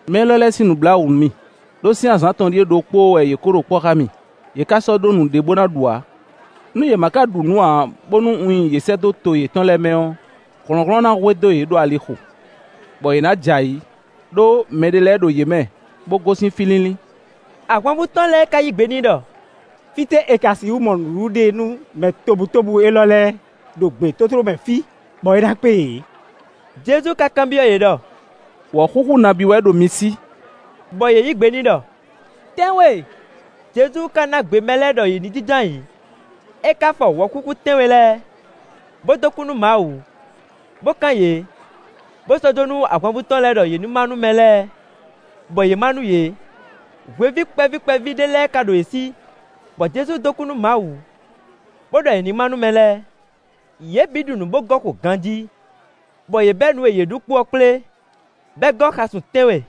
“Mɛ élɔ́ lɛ́ɛ sín nǔ blá wǔ nú mì, ɖó sín azǎn atɔn ɖíe ɖokpóó wɛ yě kó ɖo kpɔ́ xá mì; yě ka sɔ́ ɖó nǔɖé bó ná ɖu ǎ. Nú yě ma ka ɖu nǔ ǎ, bónú un nyi yě sɛ́ dó to yětɔn lɛ́ɛ mɛ ɔ́, hlɔ̌nhlɔ́n ná hwedó yě ɖo alixo, bɔ yě ná jɛ ayǐ, ɖó mɛɖé lɛ́ɛ ɖo yě mɛ, bó gosín fí línlín.” Ahwanvú tɔn lɛ́ɛ ka yí gbe n'i ɖɔ: “Fítɛ́ è ka sixú mɔ nǔɖuɖu ɖe nú mɛ tobutóbú élɔ́ lɛ́ɛ, ɖo gbětótló mɛ fí, bɔ é ná kpé yě?” Jezu ka kanbyɔ́ yě ɖɔ: “Wɔ̌xúxú nabí wɛ ɖo mi sí?” Bɔ yě yǐ gbe n'i ɖɔ: “Tɛ́nwe.” Jezu ka ná gbe mɛ lɛ́ɛ bɔ yě jínjɔ́n ayǐ; é ka fɔ wɔ̌xúxú tɛ́nwe lɛ́ɛ, bó dó kú nú Mawu, bó kán yě, bó sɔ́ jó nú ahwanvú tɔn lɛ́ɛ nú yě ní má nú mɛ lɛ́ɛ, bɔ yě má nú yě. Hweví kpɛví kpɛví ɖé lɛ́ɛ ka ɖo yě sí, bɔ Jezu dó kú nú Mawu, bó ɖɔ è nǐ má nú mɛ lɛ́ɛ. Yě bǐ ɖu nǔ bó gɔ́ xo ganjí, bɔ yě bɛ́ nǔ e yě ɖu kpo ɔ́ kplé, bɔ é gɔ́ xasun tɛ́nwe.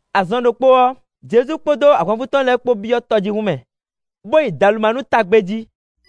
Azɔn ɖokpó ɔ́, Jezu kpódó ahwanvú tɔn lɛ́ɛ kpó byɔ́ tɔjíhún mɛ, bó yi Dalumanúta gbé jí.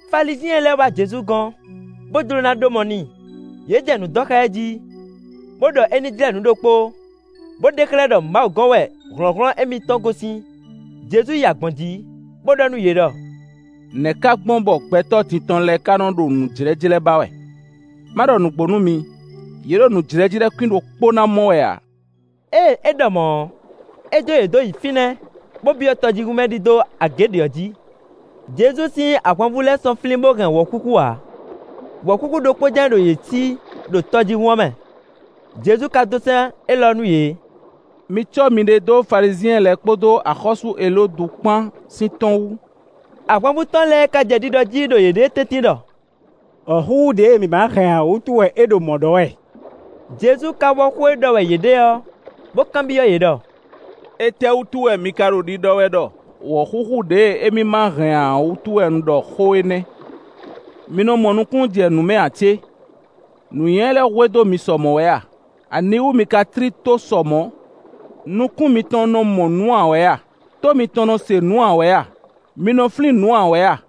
Falizyɛn lɛ́ɛ wá Jezu gɔ́n, bó jló ná ɖó mɔ n'i. Yě jɛ nǔ dɔn xá ɛ jí, bó ɖɔ é ní jlɛ́ nǔ ɖokpó, bó ɖe xlɛ́ ɖɔ Mawu gɔ́n wɛ hlɔ̌nhlɔ́n émítɔn gosín. Jezu yi agbɔ̌n jǐ, bó ɖɔ nú yě ɖɔ: “Nɛ̌ ka gbɔn bɔ gbɛtɔ́ din tɔn lɛ́ɛ ká nɔ́ ɖo nǔjlɛ́jlɛ́ ba wɛ? Má ɖɔ nǔgbó nú mi: yě ɖo nǔjlɛ́jlɛ́ kwín ɖokpó ná mɔ wɛ ǎ.” Ée é ɖɔ mɔ̌ ɔ́, é jó yě dó nyi fínɛ́, bó byɔ́ tɔjíhún mɛ ɖidó agě ɖě ɔ́ jǐ. Jezu sín ahwanvú lɛ́ɛ sɔ́ flín bó hɛn wɔ̌xúxú ǎ; wɔ̌xúxú ɖokpó jɛ́n ɖo yě sí ɖo tɔjíhún ɔ́ mɛ. Jezu ka dó sɛ́n élɔ́ nú yě: “Mi cɔ́ miɖée dó Falizyɛn lɛ́ɛ kpódó axɔ́sú Elódu kpan sín tɔ́n wú.” Ahwanvú tɔn lɛ́ɛ ka jɛ ɖiɖɔ jí ɖo yěɖée tɛ́ntin ɖɔ: “Wɔ̌xúxú ɖěe mǐ má hɛn ǎ wútu wɛ é ɖo mɔ̌ ɖɔ wɛ.” Jezu ka wɔ́ xó e ɖɔ wɛ yě ɖe ɔ́, bó kanbyɔ́ yě ɖɔ: “Étɛ́wútu wɛ mi ka ɖo ɖiɖɔ wɛ ɖɔ wɔ̌xúxú ɖěe émí ma hɛn ǎ wútu wɛ un ɖɔ xó énɛ́? Mi nɔ mɔ nukúnnú jɛ nǔ mɛ ǎ cé? Nǔnywɛ́ lɛ́ hwedó mi sɔ mɔ̌ wɛ a? Aniwú mi ka tlí tó sɔ mɔ̌? Nukún mitɔn nɔ mɔ nǔ ǎ wɛ a? Tó mitɔn nɔ se nǔ ǎ wɛ a? Mi nɔ flín nǔ ǎ wɛ a?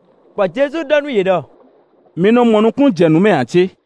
Bɔ Jezu ɖɔ nú yě ɖɔ: “Mi nɔ mɔ nukúnnú jɛ nǔ mɛ ǎ cé?”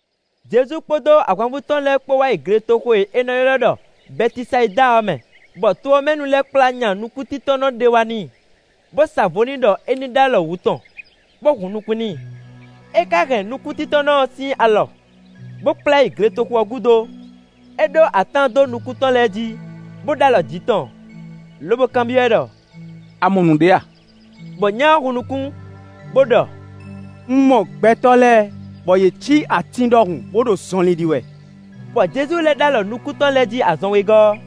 Jezu kpódó ahwanvú tɔn lɛ́ɛ kpó wá yi gletoxo e è nɔ ylɔ́ ɖɔ Bɛtisayida ɔ́ mɛ, bɔ to ɔ́ mɛ nu lɛ́ɛ kplá nya nukúntíntɔ́nnɔ ɖé wá n'i, bó sa vo n'i ɖɔ é ní ɖó alɔ wǔ tɔn, bó hun nukún n'i. É ka hɛn nukúntíntɔ́nnɔ ɔ́ sín alɔ, bó kplá ɛ yi gletoxo ɔ́ gúdo; é ɖó atán dó nukún tɔn lɛ́ɛ jí, bó ɖó alɔ jǐ tɔn, lobo kanbyɔ́ ɛ ɖɔ: “A mɔ nǔɖé a?” Bɔ nya ɔ́ hun nukún, bó ɖɔ: “Un mɔ gbɛtɔ́ lɛ́ɛ, bɔ yě cí atín ɖɔhun, bó ɖo zɔnlin ɖi wɛ.” Bɔ Jezu lɛ́ ɖó alɔ nukún tɔn lɛ́ɛ jí azɔn wegɔ́ ɔ́,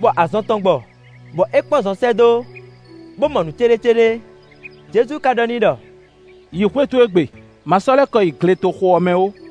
bɔ azɔn tɔn gbɔ, bɔ é kpɔ́n zɔ sɛ́ dó, bó mɔ nǔ céɖécéɖé. Jezu ka ɖɔ n'i ɖɔ: “Yi xwé towe gbe; ma sɔ́ lɛ́ kɔ yi gletoxo ɔ́ mɛ ó.”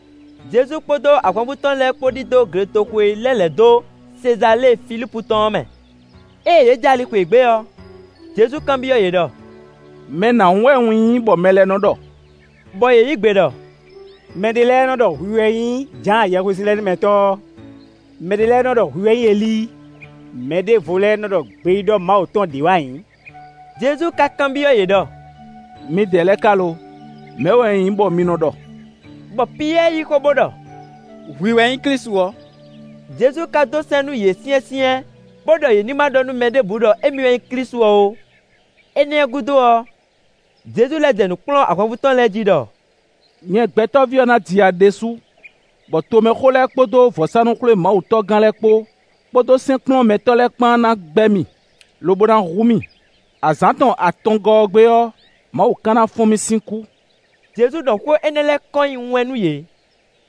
Jezu kpódó ahwanvú tɔn lɛ́ɛ kpó ɖidó gletoxo e lɛ́ lɛ̌ dó Sezalée Filípu tɔn ɔ́ mɛ. Ée yě jɛ ali xweyǐgbe ɔ́, Jezu kanbyɔ́ yě ɖɔ: “Mɛ nǎhún wɛ un nyí bɔ mɛ lɛ́ɛ nɔ́ ɖɔ?” Bɔ yě yǐ gbe ɖɔ: “Mɛ ɖé lɛ́ɛ nɔ́ ɖɔ hwi wɛ nyí Jǎan Yɛhwesinlɛnúmɛtɔ́ ɔ́; mɛ ɖě nɔ ɖɔ hwi wɛ nyí Elíi; mɛɖěvo lɛ́ɛ nɔ́ ɖɔ gbeyíɖɔ Mawu tɔn lɛ́ɛ ɖě wɛ a nyǐ.” Jezu ka kanbyɔ́ yě ɖɔ: “Midɛɛ lɛ́ɛ ka lo, mɛ̌ wɛ un nyí bɔ mi nɔ ɖɔ?” Bɔ Piyɛ́ɛ yí xó bó ɖɔ: “Hwi wɛ nyí Klísu ɔ́.” Jezu ka dó sɛ́n nú yě syɛ́nsyɛ́n bó ɖɔ yě ní ma ɖɔ nú mɛ ɖěbǔ ɖɔ émí wɛ nyí Klísu ɔ́ ó. Énɛ́ ɔ́ gúdo ɔ́, Jezu lɛ́ jɛ nǔ kplɔ́n ahwanvú tɔn lɛ́ɛ jí ɖɔ: “Nyɛ Gbɛtɔ́ví ɔ́ ná ji ya ɖésú bɔ tomɛxó lɛ́ɛ kpódó vɔ̌sánú-xwlémawutɔ́gán lɛ́ɛ kpó, kpódó sɛ́nkplɔ́nmɛtɔ́ lɛ́ɛ kpán ná gbɛ́ mì, lobo ná hu mì; azǎn tɔn atɔngɔ́ ɔ́ gbe ɔ́, Mawu ka ná fɔ́n mì sín kú.” Jezu ɖɔ xó énɛ́ lɛ́ɛ kɔn nyi wɛn nú yě.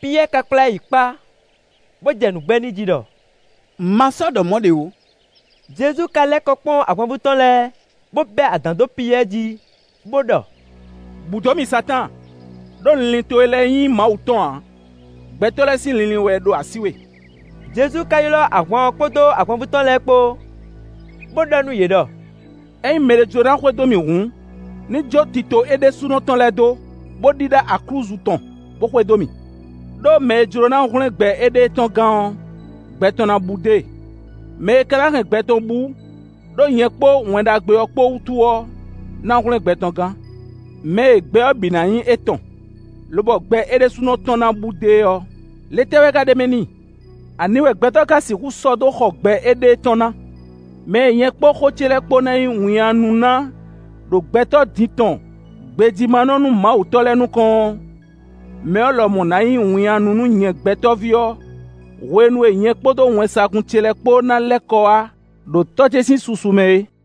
Piyɛ́ɛ ka kplá ɛ yi kpá, bó jɛ nǔ gbɛ́ n'i jí ɖɔ: “Ma sɔ́ ɖɔ mɔ̌ ɖě ó.” Jezu ka lɛ́ kɔ kpɔ́n ahwanvú tɔn lɛ́ɛ, bó bɛ́ adǎn dó Piyɛ́ɛ jí, bó ɖɔ: “Bǔ dó mì Satáan! Đó linlin towe lɛ́ɛ nyí Mawu tɔn ǎ; gbɛtɔ́ lɛ́ɛ sín linlin wɛ ɖo así we.” Jezu ka ylɔ́ ahwan ɔ́ kpódó ahwanvú tɔn lɛ́ɛ kpó, bó ɖɔ nú yě ɖɔ: “Ényí mɛɖé jló ná xwedó mì hǔn, ní jó tito é ɖésúnɔ tɔn lɛ́ɛ dó, bó ɖíɖá aklúzu tɔn, bó xwedó mì. Đó mɛ e jló ná hwlɛ́n gbɛ éɖée tɔn gán ɔ́, gbɛ tɔn ná bú dó e; mɛ e ka ná hɛn gbɛ tɔn bú ɖó nyɛ kpó Wɛn Ɖagbe ɔ́ kpó wútu ɔ́, ná hwlɛ́n gbɛ tɔn gán. Mɛ e gbɛ ɔ́ bǐ ná nyí étɔn, lobɔ gbɛ é ɖésúnɔ tɔn ná bú dó e ɔ́, le tɛ́ wɛ ka ɖ'é mɛ n'i? Ani wɛ gbɛtɔ́ ka sixú sɔ́ dó xɔ gbɛ éɖée tɔn ná? Mɛ e nyɛ kpódó xó ce lɛ́ɛ kpó ná nyí winnyánú ná ɖo gbɛtɔ́ din tɔn gbejímánɔ-númawutɔ́ lɛ́ɛ nukɔn ɔ́, mɛ ɔ́ lɔmɔ̌ ná nyí winnyánú nú nyɛ Gbɛtɔ́ví ɔ́ hwenu e nyɛ kpódó wɛnsagun ce lɛ́ɛ kpó ná lɛ́ kɔ wá ɖo Tɔ́ ce sín susu mɛ é.”